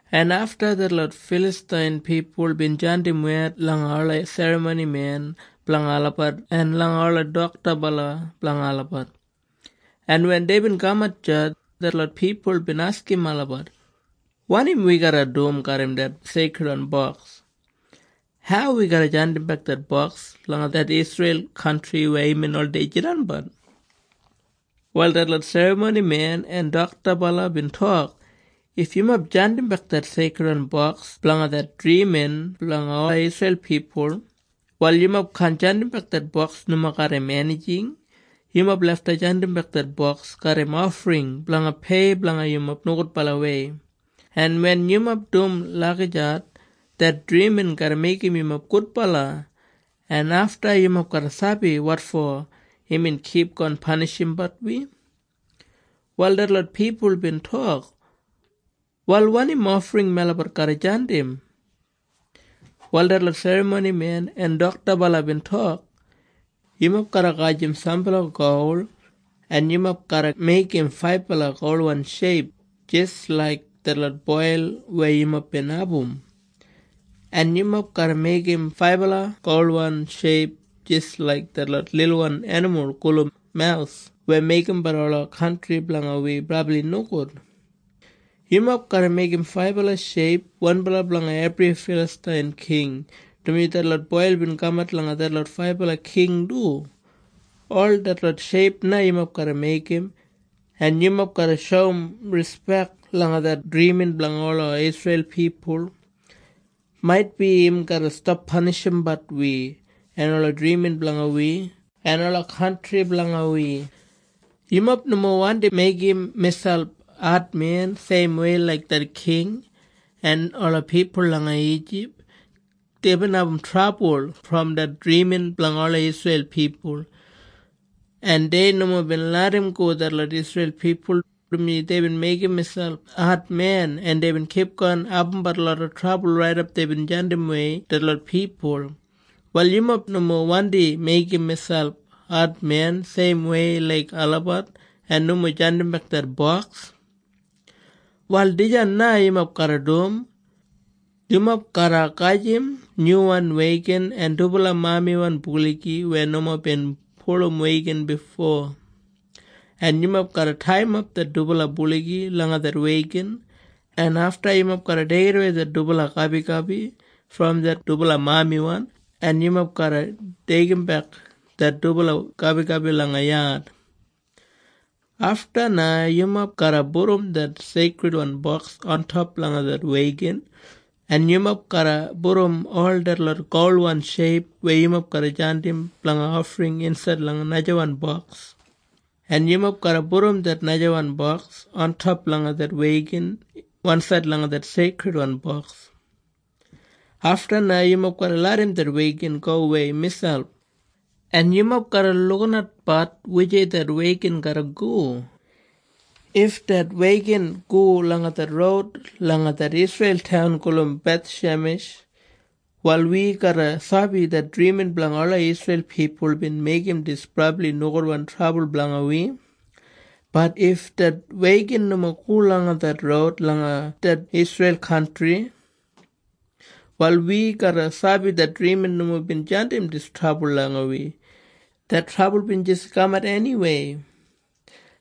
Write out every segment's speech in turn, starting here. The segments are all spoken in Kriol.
en afta detlot Filastain pipul bin jandim wed langa ola serramonimen blanga olabat en langa ola doktabala blanga olabat, en wen deibin kamat deya, detlot pipul bin askim olabat, “Wanim wi garra dum garram det Seikridwan Boks? Hau wi garra jandimbek det boks langa det Isreil kantri weya imbin oldei jidanbat?” Wal detlot serramonimen en doktabala bin tok, “If yumob jandimbek det Seikridwan Boks blanga det drimin blanga ola Isreil pipul, wal yumob kaan jandimbek det Boks nomo garram enijing. Yumob lafta jandimbek det Boks garram ofring blanga pei blanga yumob nogudbalawei, en wen yumob dum lagijat, det drimin garra meigim yumob gudbala, en afta yumob garra sabi wotfo imbin kipgon panishimbat wi.” Wal detlot pipul bin tok, “Wal wanim ofring melabat garra jandim?” Wal detlot serramonimen en doktabala bin tok, “Yumob garra gajim sambala gol, en yumob garra meigim faibala golwan sheip jis laik detlot boil weya yumob bin abum, en yumob garra meigim faibala golwan sheip jis laik detlot lilwan enimul gulum maus weya meigimbat ola kantri blanga wi brabli nogud. Yumob garra meigim faibala sheip, wanbala blanga ebri Filastain king, dumaji detlot boil bin kamat langa detlot faibala king du. Ol detlot sheip na yumob garra meigim, en yumob garra shoum rispek langa det drimin blanga ola Isreil pipul. Maitbi im garra stap panishimbat wi en ola drimin blanga wi en ola kantri blanga wi. Yumob nomo wandi meigim miselp admen seimwei laik det king en ola pipul langa Ijip. Deibin abum trabul brom det drimin blanga ola Isreil pipul. En dei nomo bin larramgo detlot Isreil pipul, dumaji deibin meigim miselp admen, en deibin kipgon abumbat loda trabul raidap deibin jandimwei detlot pipul. Wal yumob nomo wandi meigim miselp admen seimwei laik olabat en nomo jandimbek det boks. “Wal dijan na yumob garra dum. Yumob garra gajim nyuwan wegan en dubala mamiwan buligi weya nomo bin pulum wegan bifo, en yumob garra taiyimap det dubala buligi langa det wegan, en afta yumob garra deigidawei det dubala gabigabi brom det dubala mamiwan, en yumob garra deigimbek det dubala gabigabi langa yad. Afta na yumob garra pudum det Seikridwan Boks ontop langa det wegan, en yumob garra pudum ol detlot golwan sheip weya yumob garra jandim blanga ofring insaid langa najawan boks, en yumob garra pudum det najawan boks ontop langa det wegan wansaid langa det Seikridwan Boks. Afta na yumob garra larram det wegan gowei miselp, en yumob garra lukinatbat wujei det wegan garra go. If det wegan go langa det roud langa det Isreil taun gulum Bethshemesh, wal wi garra sabi det drimin blanga ola Isreil pipul bin meigim dis brabli nogudwan trabul blanga wi. Bat if det wegan nomo go langa det roud langa det Isreil kantri, wal wi garra sabi det drimin nomo bin jandim dis trabul langa wi. Det trabul bin jis kamat eniwei.”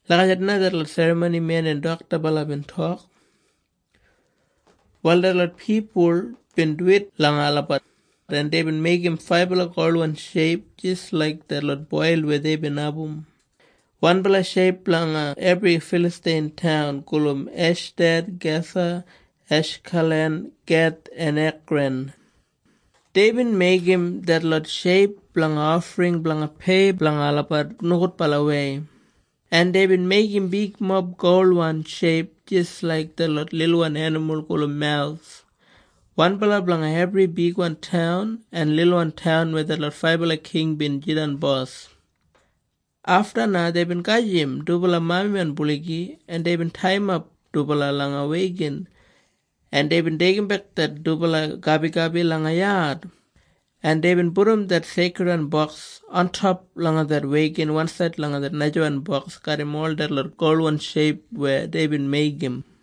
Lagijat na detlot serramonimen en doktabala bin tok. Wal detlot pipul bin duwit langa olabat, en deibin meigim faibala golwan sheip jis laik detlot boil weya deibin abum, wanbala sheip blanga ebri Filastain taun gulum Eshdad, Gasa, Eshkalan, Geth en Ekran. Deibin meigim detlot sheip blanga ofring blanga pei blanga olabat nogudbalawei, en deibin meigim bigmob golwan sheip jis laik detlot lilwan enimul gulum maus, wanbala blanga ebri bigwan taun en lilwan taun weya detlot faibala king bin jidan bos. Afta na deibin gajim dubala mamiwan buligi, en deibin taiyimap dubala langa wegan, en deibin deigimbek det dubala gabigabi langa yad, en deibin pudum det Seikridwan Boks ontop langa det wegan wansaid langa det najawan boks garram ol detlot golwan sheip weya deibin meigim.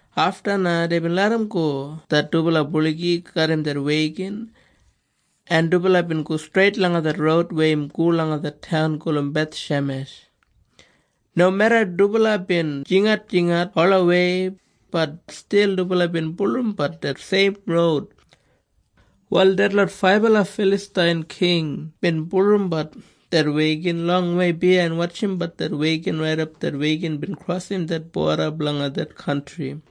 Afta na deibin larramgo det dubala buligi garram det wegan, en dubala bin go streit langa det roud weya im go langa det taun gulum Bethshemesh. Nomeda dubala bin jingatjingat olawei, bat stil dubala bin bulurrumbat det seim roud. Wal detlot faibala Filastain king bin bulurrumbat det wegan longwei biyain wotjimbat det wegan raidap det wegan bin krosim det boda blanga det kantri.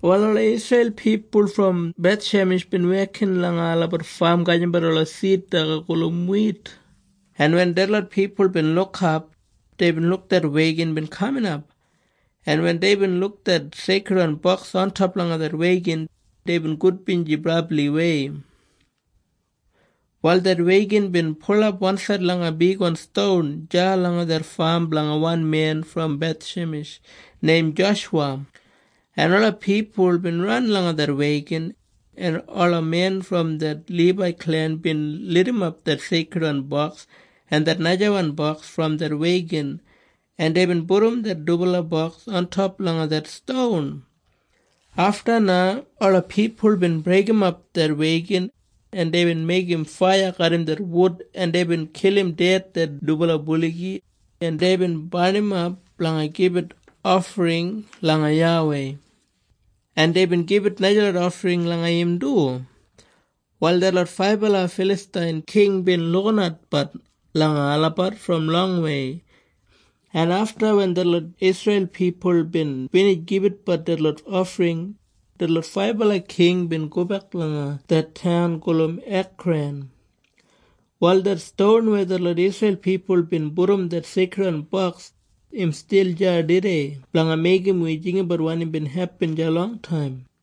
Wal ola Isreil pipul brom Bethshemesh bin wekin langa olabat fam gajimbat ola sid daga gulum wit, en wen detlot pipul bin lukap, deibin luk det wegan bin kaminap, en wen deibin luk det Seikridwan Boks ontop langa det wegan, deibin gudbinji brabliwei. Wal det wegan bin pulap wansaid langa bigwan ston deya langa det fam blanga wan men brom Bethshemesh neim Joshuwa, en ola pipul bin ran langa det wegan, en ola men brom det Libai klen bin lidimap det Seikridwan Boks en det najawan boks brom det wegan, en deibin pudum det dubala boks ontop langa det ston. Afta na ola pipul bin breigimap det wegan, en deibin meigim faiya garram det wud, en deibin kilim ded det dubala buligi, en deibin barnimap blanga gibit ofring langa YAWEI, en deibin gibit najalot ofring langa im du. Wal detlot faibala Filastain king bin lukinatbat langa olabat brom longwei, en afta wen detlot Isreil pipul bin binij gibitbat detlot ofring, detlot faibala king bin gobek langa det taun gulum Ekran. Wal det ston weya detlot Isreil pipul bin pudum det Seikridwan Boks, im stil deya tudei blanga meigim wi jinggabat wanim bin hepin deya longtaim.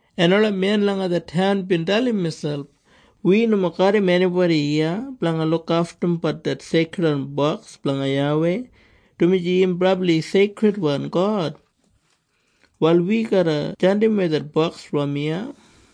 en ola men langa det taun bin dalim miselp, “Wi nomo garram enibodi iya blanga lukaftumbat det Seikridwan Boks blanga YAWEI, dumaji im brabli seikridwan God. Wal wi garra jandimwei det boks brom iya.”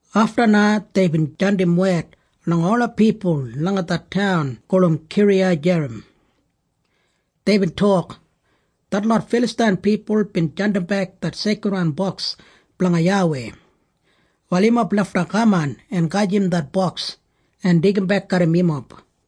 Afta na deibin jandim wed langa ola pipul langa det taun gulum Kiriyajerim. Deibin tok, “Detlot Filastain pipul bin jandimbek det Seikridwan Boks blanga YAWEI. Wal yumob lafta kaman en gajim det boks en deigimbek garram yumob.”